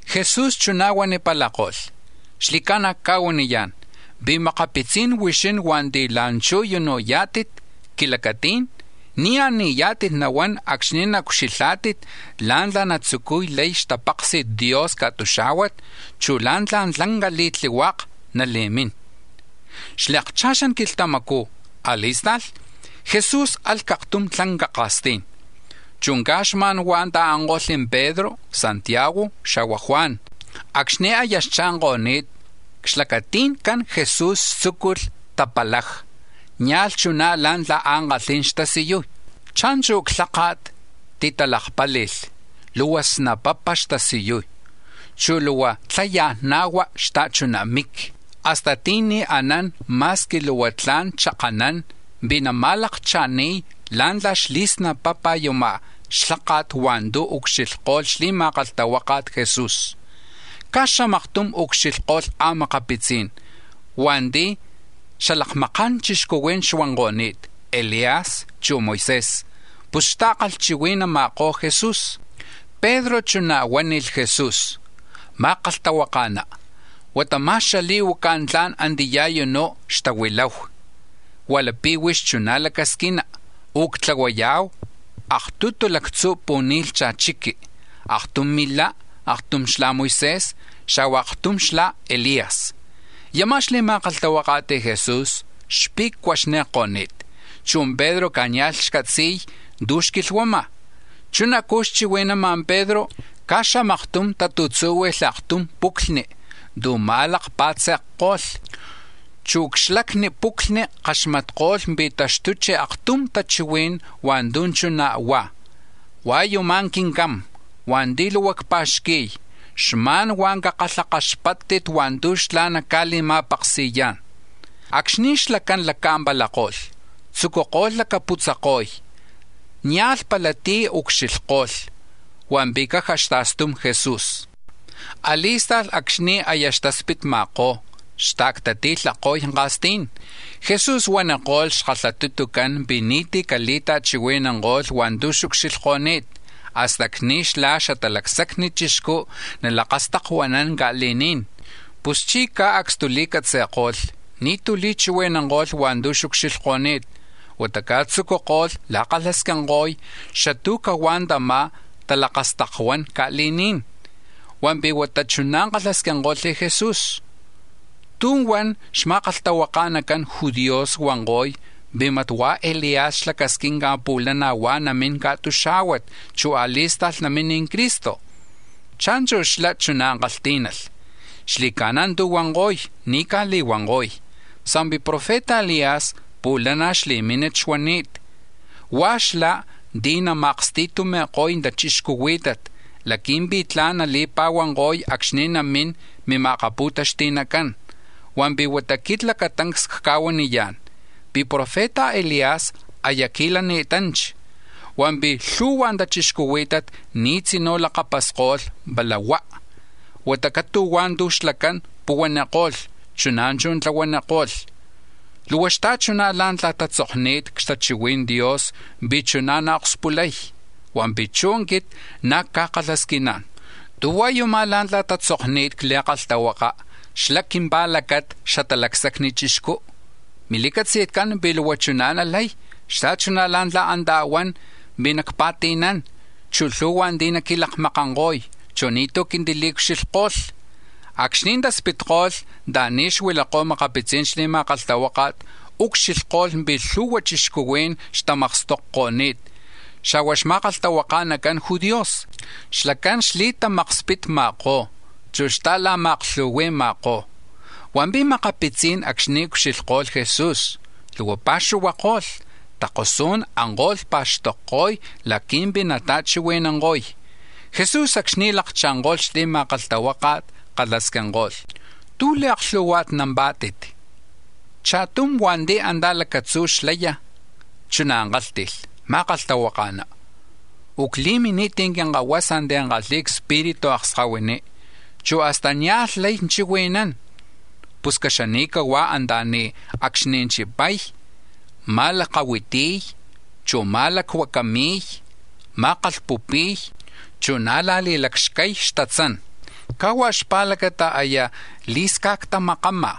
Jesús chuná̱ huanipalako̱lh: —Xli̱ca̱na̱ cca̱huaniyá̱n pi̱ makapitzi̱n huixín hua̱nti̱ la̱nchú̱ u̱nú̱ yá̱tit c-quilacatí̱n, ni̱ a̱ni̱yá̱tit nahuán acxni̱ naucxilhá̱tit la̱ntla̱ natzucuy lay xtapaksi̱t Dios ca̱tuxá̱huat, chu̱ la̱ntla̱ tlanca li̱tlihuaka̱ nali̱mín. A̱li̱akcha̱xan quilhtamacu̱ a̱li̱sta̱lh, Jesús alh c-aktum tlanca ka̱stí̱n, chu̱ caj xma̱n huá̱ ta̱anko̱lh Pedro, Santiago, xa̱hua̱ Juan. Acxni̱ aya xcha̱nko̱ni̱t, c-xlacati̱ncán Jesús tzúculh talakpali̱y, nia̱lh chuná̱ la̱ntla̱ ankalhí̱n xtasiyuy. Cha̱nchu̱ xlháka̱t, titalakpáli̱lh, luhua snapapa̱ xtasiyuy, chu̱ luhua tzayajna̱hua, xta̱chuná̱ miqui, hasta ti̱ni̱ anán ma̱squi luhua tla̱n chakanán, pi̱ nama̱lakcha̱ni̱y la̱ntla̱ xli̱snapapa̱ yama̱ xlháka̱t hua̱ntu̱ ucxilhko̱lh xli̱ma̱kalhtahuaka̱t Jesús. Caj xamaktum ucxilhko̱lh a̱makapitzí̱n hua̱nti̱ xalakmaka̱n chixcuhuí̱n xuanko̱ni̱t, Elías, chu̱ Moisés, pus xta̱la̱xakatli̱ma̱kó̱ Jesús. Pedro chuná̱ huánilh Jesús: —Ma̱kalhtahuaka̱ná, huata ma̱x xali̱huaca̱ tla̱n antiyá̱ u̱nú̱ xtahuilahu, hua̱ lapi̱ huix chuná̱ lacasquina, u̱ctlahuaya̱hu aktutu lactzu̱ pu̱ni̱lhcha̱ chiqui, aktum milá, aktum xla Moisés, xa̱hua̱ aktum xla Elías. Yama̱ xli̱ma̱kalhtahuaka̱t Jesús xpe̱cuaxni̱ko̱ni̱t, chu̱ Pedro, caj nia̱lh xcatzi̱y tu̱ xquilhuama̱. Chunacú̱ xchihui̱nama̱ Pedro, caj xamaktum tatu̱tzúhui̱lh aktum puclhni̱ tu̱ ma̱lakapa̱tze̱kko̱lh, chu̱ c-xlacni puclhni̱ kaxmatko̱lh pi̱ taxtuchi̱ aktum tachihuí̱n hua̱ntu̱ chuná̱ huá̱: “Hua̱ yumá̱ Quincam hua̱nti̱ luhua cpa̱xqui̱y, xma̱n luhua cakalhakaxpáttit hua̱ntu̱ xlá̱ naca̱li̱ma̱paksi̱yá̱n.” Acxni̱ xlacán laca̱mpalako̱lh, tzucuko̱lh lacaputzako̱y, nia̱lh pala tí̱ ucxilhko̱lh, hua̱mpi̱ caja xta̱stum Jesús. A̱li̱sta̱lh acxni̱ aya xtaspitma̱kó̱, xta̱ctati̱lhako̱y ka̱stí̱n, Jesús huaniko̱lh xkalhatutucán pi̱ ni̱tí̱ cali̱ta̱chihui̱nanko̱lh hua̱ntu̱ xucxilhko̱ni̱t hasta acxni̱ xlá̱ Xatalacsacni Chixcú̱ nalakastakuanán ca̱li̱ní̱n. Puschí̱ caj acstuli̱catzi̱ko̱lh, ni̱tú̱ li̱chihui̱nanko̱lh hua̱ntu̱ xucxilhko̱ni̱t, huata caj tzucuko̱lh la̱kalhasquinko̱y xatú̱ cahuá̱ tama̱ talakastakuán ca̱li̱ní̱n. Hua̱mpi̱ huata chuná̱ kalhasquinko̱lh Jesús: —¿Tú̱huan xma̱kalhtahuaka̱nacan judíos huanko̱y pi̱ mat hua̱ Elías xlacasquinca̱ pu̱lana̱ huá̱ namín ca̱tuxá̱huat, chu̱ a̱li̱sta̱lh namín Cristo? Cha̱nchu̱ xlá̱ chuná̱ kalhtí̱nalh: —Xli̱ca̱na̱ tu̱ huanko̱y, ni̱ caj li̱huanko̱y, sa̱mpi̱ profeta Elías pu̱lana̱ xli̱mínat xuani̱t, hua̱ xlá̱ ti̱ nama̱aksti̱tumi̱ko̱y tachixcuhuí̱tat laqui̱mpi̱ tla̱n nali̱pa̱huanko̱y acxni̱ namín mima̱akapu̱taxti̱nacán. Hua̱mpi̱ huata quit lacatancs cca̱huaniyá̱n pi̱ profeta Elías aya qui̱lani̱tanchi, hua̱mpi̱ lhu̱hua tachixcuhuí̱tat ni̱ tzinú̱ lakapasko̱lh pala huá̱, huata catu̱hua̱ tu̱ xlacán puhuaniko̱lh, chuná̱ chú̱ tlahuaniko̱lh, luhua xta̱chuná̱ la̱ntla̱ tatzokni̱t c-xtachihui̱n Dios pi̱ chuná̱ naakspulay. Hua̱mpi̱ chú̱ quit na̱ cca̱kalhasquiná̱n: ¿Tú̱ hua̱ yumá̱ la̱ntla̱ tatzokni̱t c-Li̱kalhtahuaka̱ xla quimpa̱lacata̱ Xatalacsacni Chixcú? Mili̱catzi̱tcán pi̱ luhua chuná̱ nalay xta̱chuná̱ la̱ntla̱ antá̱ huan pi̱ nacpa̱ti̱nán, chu̱ lhu̱hua̱ ti̱ naquilakmakanko̱y, chu̱ ni̱tú̱ naquili̱ucxilhko̱y. Acxni̱ taspitko̱lh anta̱ni̱ xuilakó̱ a̱makapitzi̱n xli̱ma̱kalhtahuáka̱t, ucxilhko̱lh pi̱ lhu̱hua chixcuhuí̱n xtamakstokko̱ni̱t, xa̱hua̱ xma̱kalhtahuaka̱nacan judíos, xlacán xli̱tamakspitma̱kó̱, chu̱ xta̱la̱ma̱aklhuhui̱ma̱kó̱. Hua̱mpi̱ makapitzí̱n acxni̱ ucxilhko̱lh Jesús, luhua pa̱xuhuako̱lh, takosú̱n anko̱lh pa̱xtokko̱y laqui̱mpi̱ nata̱chihui̱nanko̱y. Jesús acxni̱ lakcha̱nko̱lh xli̱ma̱kalhtahuáka̱t, kalhasquinko̱lh: —¿Tú̱ li̱aklhu̱hua̱tnampá̱tit? Cha̱tum hua̱nti̱ antá̱ lacatzú̱ xlaya̱, chuná̱ kálhti̱lh: —Ma̱kalhtahuaka̱ná, u̱cli̱mini̱t quinkahuasa ti̱ kalhi̱y cspiritu akskahuiní, chu̱ hasta nia̱lh lay chihui̱nán. Pus caxani̱cahuá̱ anta̱ni̱ acxni̱ chipay, ma̱lakahuitiy, chu̱ ma̱lacuacami̱y, ma̱kalhpupi̱y, chu̱ na̱ la̱lacxcay xtatzán; caj huá̱ xpa̱lacata aya li̱sca̱ctamakama̱.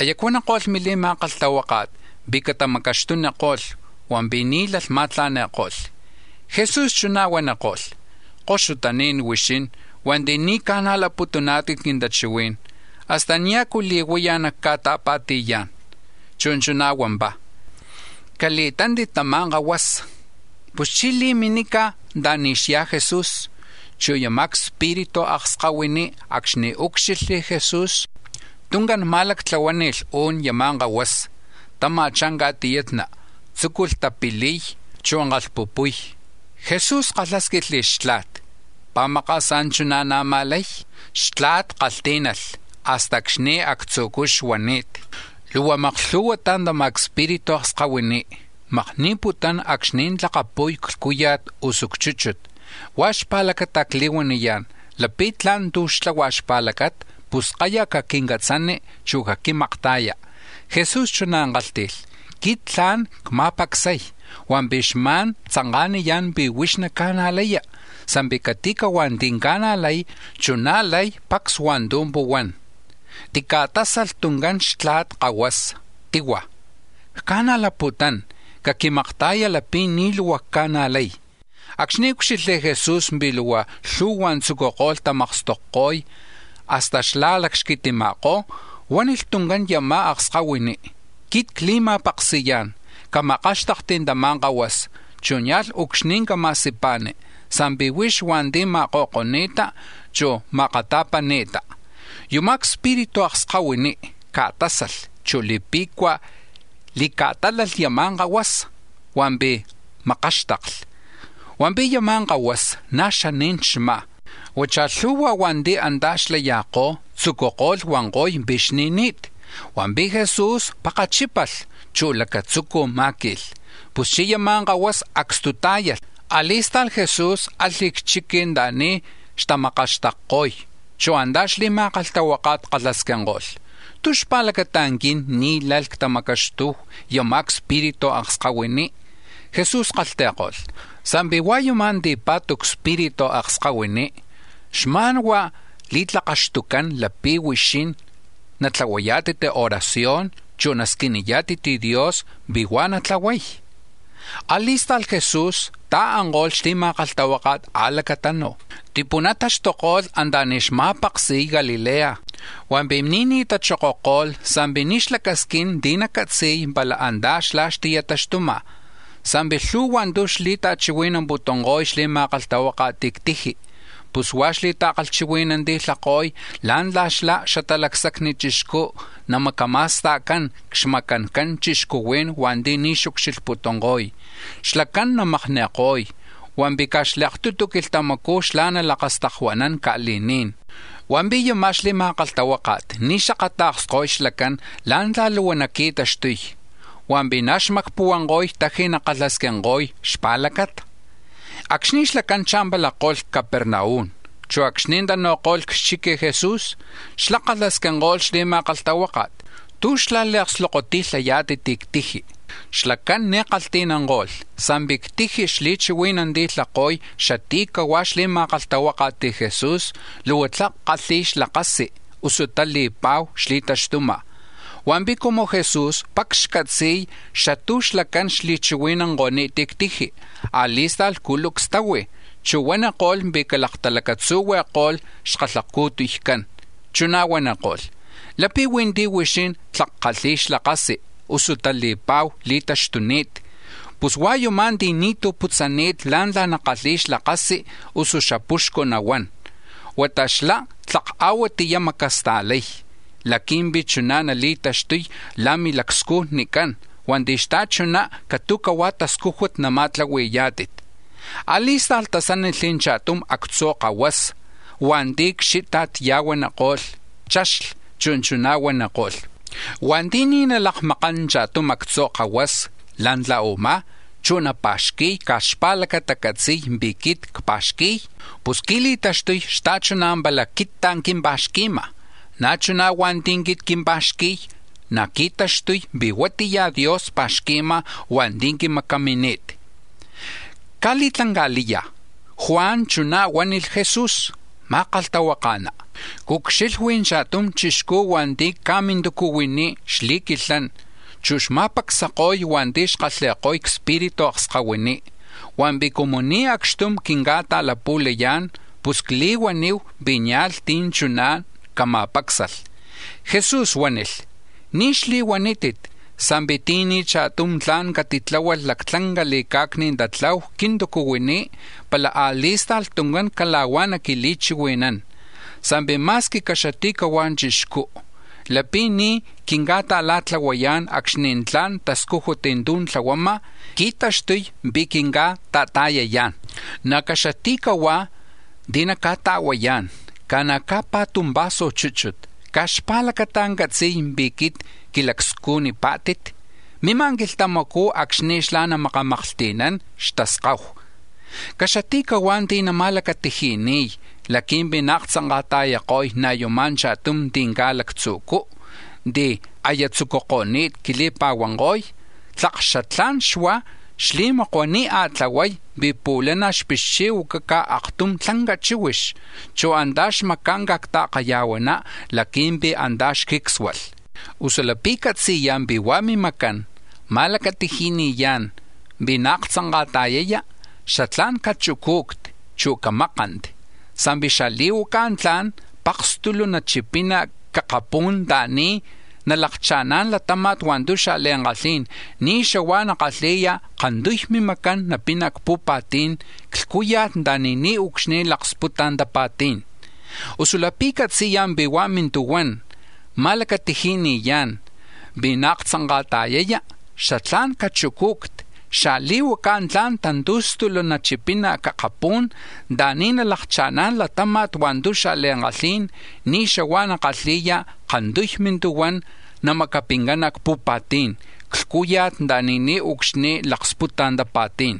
Aya cuaniko̱lh mili̱ma̱kalhtahuáka̱t pi̱ catamacaxtuniko̱lh, hua̱mpi̱ ni̱ lay ma̱tla̱ni̱ko̱lh. Jesús chuná̱ huaniko̱lh: —Koxutaní̱n huixín hua̱nti̱ ni̱ ca̱najlaputuná̱tit quintachihuí̱n. ¿Hasta niajcu li̱huaya̱ nactica̱ta̱pa̱ti̱yá̱n? Chu̱ chuná̱ huampá̱: —Cali̱tántit tama̱ kahuasa. Puschí̱ li̱minica̱ anta̱ni̱ xyá̱ Jesús. Chu̱ yama̱ cspiritu akskahuiní, acxni̱ úcxilhli̱ Jesús, tuncán ma̱lactlahuáni̱lh u̱n yama̱ kahuasa, tama̱chá̱ ca̱tiyatna, tzúculh tapiliy, chu̱ kalhpupuy. Jesús kalhásquilh xtla̱t: —¿Pi̱ maka̱sá̱ chuná̱ na̱má̱ lay? Xatla̱t kalhtí̱nalh: —Hasta acxni̱ actzu̱cú̱ xuani̱t. Luhua maklhu̱huatá̱ tama̱ cspiritu akskahuiní̱ makni̱putún acxni̱ tlakapu̱y c-lhcúya̱t, usu c-chúchut. Huá̱ xpa̱lacata̱ cli̱huaniyá̱n, lapi̱ tla̱n tu̱ xtlahua̱ xpa̱lacata, pus kayaj caquinca̱catzani, chu̱ caquinca̱makta̱ya. Jesús chuná̱ kálhti̱lh: —Quit tla̱n cma̱pacsay, hua̱mpi̱ xma̱n tzanka̱niyá̱n pi̱ huix naca̱najlaya, sa̱mpi̱ cati̱huá̱ ti̱ ca̱najlay, chuná̱ lay pacs hua̱ntu̱ puhuán. Tica̱tásalh tuncán xtla̱t kahuasa, tihua̱: —Cca̱najlaputún; caquimakta̱ya̱ laqui̱mpi̱ tla̱n xacca̱nájlalh. Acxni̱ úcxilhli̱ Jesús pi̱ luhua lhu̱hua̱ tzucuko̱lh tamakstokko̱y hasta xla̱lacxquitima̱kó̱, huánilh tuncán yama̱ akskahuiní: —Quit cli̱ma̱paksi̱yá̱n, camakáxtakti̱ tama̱ kahuasa, chu̱ nia̱lh ucxni̱ cama̱sipa̱ni, sa̱mpi̱ huix hua̱nti̱ ma̱ko̱ko̱ni̱ta, chu̱ ma̱akata̱pani̱ta. Yama̱ cspiritu akskahuiní̱ ca̱tásalh, chu̱ li̱pe̱cua̱ li̱ca̱tálalh yama̱ kahuasa, hua̱mpi̱ makáxtakli. Hua̱mpi̱ yama̱ kahuasa ná̱ xaní̱n xmá̱; huachá̱ lhu̱hua̱ hua̱nti̱ antá̱ xlaya̱kó̱ tzucuko̱lh huanko̱y pi̱ xni̱ni̱t. Hua̱mpi̱ Jesús pakchípalh, chu̱ lacatzucu̱ má̱qui̱lh. Puschí̱ yama̱ kahuasa acstutá̱yalh. A̱li̱sta̱lh Jesús alh c-chiqui̱ anta̱ni̱ xtamakaxtakko̱y, chu̱ antá̱ xli̱ma̱kalhtahuáka̱t kalhasquinko̱lh: —¿Tú̱ xpa̱lacata̱ quin ni̱ lalh ctamacaxtuhu yama̱ cspiritu akskahuiní? Jesús kalhti̱ko̱lh: —Sa̱mpi̱ hua̱ yuma̱ ti̱pa̱tu cspiritu akskahuiní, xma̱n huá̱ li̱tlakaxtucán lapi̱ huixín nakalhxtaknaná̱tit, natlahuayá̱tit oración, chu̱ nasquiniyá̱tit Dios pi̱ huá̱ natlahuay. A̱li̱sta̱lh Jesús ta̱anko̱lh xli̱ma̱kalhtahuáka̱t a̱lacatanu̱, tipunataxtuko̱lh anta̱ni̱ xma̱paksi̱y Galilea, hua̱mpi̱ ni̱ní̱ tachokoko̱lh sa̱mpi̱ ni̱ xlacasquín tí̱ nacatzi̱y pala antá̱ xlá̱ xti̱taxtuma̱. Sa̱mpi̱ lhu̱hua̱ tu̱ xli̱ta̱chihui̱namputunko̱y xli̱ma̱kalhtahuáka̱t c-tiji. Pus huá̱ xli̱ta̱kalhchihui̱nanti̱lhako̱y la̱ntla̱ xlá, Xatalacsacni Chixcú, namacama̱sta̱cán c-xmacancan chixcuhuí̱n hua̱nti̱ ni̱ xucxilhputunko̱y; xlacán namakni̱ko̱y, hua̱mpi̱ caj xli̱aktutu quilhtamacú̱ xlá̱ nalakastakuanán ca̱li̱ní̱n. Hua̱mpi̱ yama̱ xli̱ma̱kalhtahuáka̱t ni̱ xakata̱ksko̱y xlacán la̱ntla̱ luhua naqui̱taxtuy, hua̱mpi̱ na̱ xmacpuhuanko̱y tlak nakalhasquinko̱y xpa̱lacata. Acxni̱ xlacán cha̱mpalako̱lh c-Capernaum, chu̱ acxni̱ tanu̱ko̱lh c-chiqui Jesús kalhasquinko̱lh xli̱ma̱kalhtahuáka̱t: —¿Tú̱ xla̱li̱ma̱klu̱hui̱pá̱tit c-tiji? Xlacán ni̱ kalhti̱nanko̱lh sa̱mpi̱ c-tiji̱ xli̱chihui̱nanti̱lhako̱y xatí̱ cahuá̱ xli̱ma̱kalhtahuaka̱t Jesús, xapuxcu nahuán, usu tali̱pa̱hu xli̱taxtuma̱. Hua̱mpi̱ cumu Jesús pacs xcatzi̱y xatú̱ xlacán xli̱chihui̱nanko̱ni̱t c-tiji, a̱li̱sta̱lh culucs tahui̱, chu̱ huaniko̱lh pi̱ calaktalacatzuhui̱ko̱lh xkalhacu̱tuycán, chuná̱ huaniko̱lh: —Lapi̱ huí̱ ti̱ huixín tlak kalhi̱y xlakasi, usu tali̱pa̱hu li̱taxtuni̱t, pus hua̱ yumá̱ ti̱ ni̱tú̱ putzani̱t la̱ntla̱ nakalhi̱y xlakasi, usu xapuxcu nahuán, huata xlá̱ tlak a̱huatiyá̱ namacasta̱lay laqui̱mpi̱ chuná̱ nali̱taxtuy la̱ milacscujnicán hua̱nti̱ xta̱chuná̱ catu̱cahuá̱ tascújut nama̱tlahui̱yá̱tit. A̱li̱sta̱lh tasánilh cha̱tum actzu̱ kahuasa hua̱nti̱ c-xíta̱t ya̱huaniko̱lh, chaxli, chu̱ chuná̱ huaniko̱lh: —Hua̱nti̱ ni̱ nalakmakán cha̱tum actzu̱ kahuasa la̱ntla̱ u̱má̱, chu̱ napa̱xqui̱y caj xpa̱lacata catzi̱y pi̱ quit cpa̱xqui̱y, pus qui̱li̱taxtuy xta̱chuna̱ pala quittá̱ quimpa̱xqui̱ma̱, na̱ chuná̱ hua̱nti̱ quit quimpa̱xqui̱y, na̱ qui̱taxtuy pi̱ huatiya Dios pa̱xqui̱ma̱ hua̱nti̱ quimacamini̱t. Caj li̱tlanca̱liya̱ Juan chuná̱ huánilh Jesús: —Ma̱kalhtahuaka̱ná, cucxilhui̱ cha̱tum chixcú̱ hua̱nti̱ caj mintucuhuiní̱ xli̱quilhán, chu̱ xma̱pacsako̱y hua̱nti̱ xkalhi̱ko̱y cspiritu akskahuiní, hua̱mpi̱ cumu ni̱ acxtum quinca̱ta̱lapu̱layá̱n, pus cli̱huanihu pi̱ nia̱lh tí̱ chuná̱ cama̱pácsalh. Jesús huánilh: —Ni̱ xtili̱huanítit, sa̱mpi̱ ti̱ni̱ cha̱tum tla̱n catitláhualh lactlanca li̱ca̱cni tatlahu c-quintucuhuiní̱ pala a̱li̱sta̱lh tuncán cala̱huá̱ naquili̱chihui̱nán. Sa̱mpi̱ ma̱squi caxati̱cahua̱ chixcú, lapi̱ ni̱ quinca̱ta̱la̱tlahuayá̱n acxni̱ tla̱n tascújut tu̱ tlahuama̱, qui̱taxtuy pi̱ quinca̱ta̱ta̱yayá̱n. Na̱ caxati̱cahuá̱ ti̱ naca̱ta̱huayá̱n ca̱na̱ caj paktum vaso chúchut, caj xpa̱lacata catzi̱y pi̱ quit quilacscujnipá̱tit, mima̱ quilhtamacú̱ acxni̱ xlá̱ namaklhti̱nán xtaskahu. “Caxati̱cahuá̱ ti̱ nama̱tlahui̱yá̱n tu̱ ni̱ tla̱n laqui̱mpi̱ naaktzanka̱ta̱yako̱y ná̱ yuma̱ cha̱tum ti̱ lactzu̱cú, ti̱ aya tzucuko̱ni̱t quili̱pa̱huanko̱y, tlak xatlá̱n xuá̱, xli̱makua̱ ni̱ a̱tlahuay, pi̱ pu̱lana̱ xpixchi̱huacaca̱ aktum tlanca chíhuix, chu̱ antá̱ xmaca̱nca̱ c-ta̱kaya̱huaná̱ laqui̱mpi̱ antá̱ xjícsualh. Usu lapi̱ catzi̱ya̱ pi̱ huá̱ mimacán ma̱lacatiji̱ni̱yá̱n pi̱ naaktzanka̱ta̱yaya, xatlá̱n cachucu̱cti, chu̱ camákanti; sa̱mpi̱ xali̱huaca̱ tla̱n pakastulu̱ nachipina̱ c-akapú̱n anta̱ni̱ nalakcha̱ná̱n latáma̱t hua̱ntu̱ xa̱li̱ankalhí̱n, ni̱ xahua̱ nakalhi̱ya̱ kantuy mimacán, napina̱ c-pu̱pa̱tí̱n, c-lhcúya̱t, anta̱ni̱ niucxni̱ laksputa̱ tapa̱tí̱n. Usu lapi̱ catzi̱ya̱ pi̱ huá̱ mintuhuán nama̱akchakxayá̱n pi̱ naaktzanka̱ta̱yaya, xatlá̱n cachucu̱cti, xali̱huaca̱ tla̱n tantu̱stulu̱ nachipina̱ c-akapú̱n anta̱ni̱ nalakcha̱ná̱n latáma̱t hua̱ntu̱ xa̱li̱ankalhí̱n, ni̱ xahua̱ nakalhi̱ya̱ kantuy mintuhuán, namacapincana̱ c-pu̱pa̱tí̱n, c-lhcúya̱t anta̱ni̱ niucxni̱ laksputa̱ tapa̱tí̱n.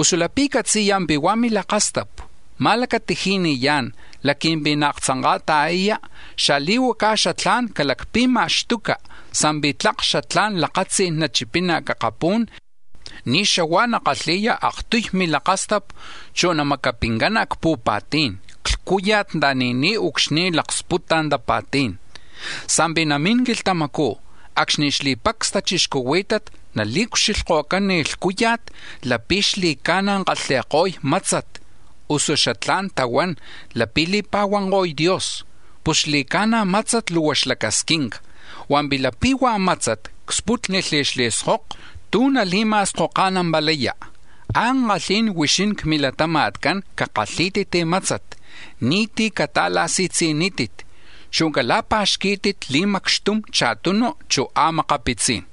Usu lapi̱ catzi̱ya̱ pi̱ huá̱ milakastapu̱ nama̱lacatiji̱ni̱yá̱n laqui̱mpi̱ naaktzanka̱ta̱yaya, xali̱huacá̱ xatla̱n calacpi̱ma̱xtuca̱ sa̱mpi̱ tlak xatlá̱n lakatzí̱n nachipina̱ c-akapú̱n, ni̱ xahua̱ nakalhi̱ya̱ aktuy milakastapu, chu̱ namacapincana̱ c-pu̱pa̱tí̱n; c-lhcúya̱t anta̱ni̱ niucxni̱ laksputa̱ tapa̱tí̱n. “Sa̱mpi̱ namín quilhtamacú̱ acxni̱ xli̱pacs tachixcuhuí̱tat nali̱ucxlhko̱cán lhcúya̱t lapi̱ xli̱ca̱na̱ kalhi̱ko̱y mátzat (usu xatlá̱n tahuán: lapi̱ li̱pa̱huanko̱y Dios). Pus xli̱ca̱na̱, mátzat luhua xlacasquinca, hua̱mpi̱ lapi̱ huá̱ mátzat cspútnilh xli̱skoko, ¿tú̱ nali̱ma̱skoka̱nampalaya? Ankalhí̱n huixín, c-milatama̱tcán, cakalhí̱tit mátzat, ni̱tí̱ cata̱la̱si̱tzi̱nítit, chu̱ cala̱pa̱xquí̱tit li̱macxtum cha̱tunu, chu̱ a̱makapitzí̱n.”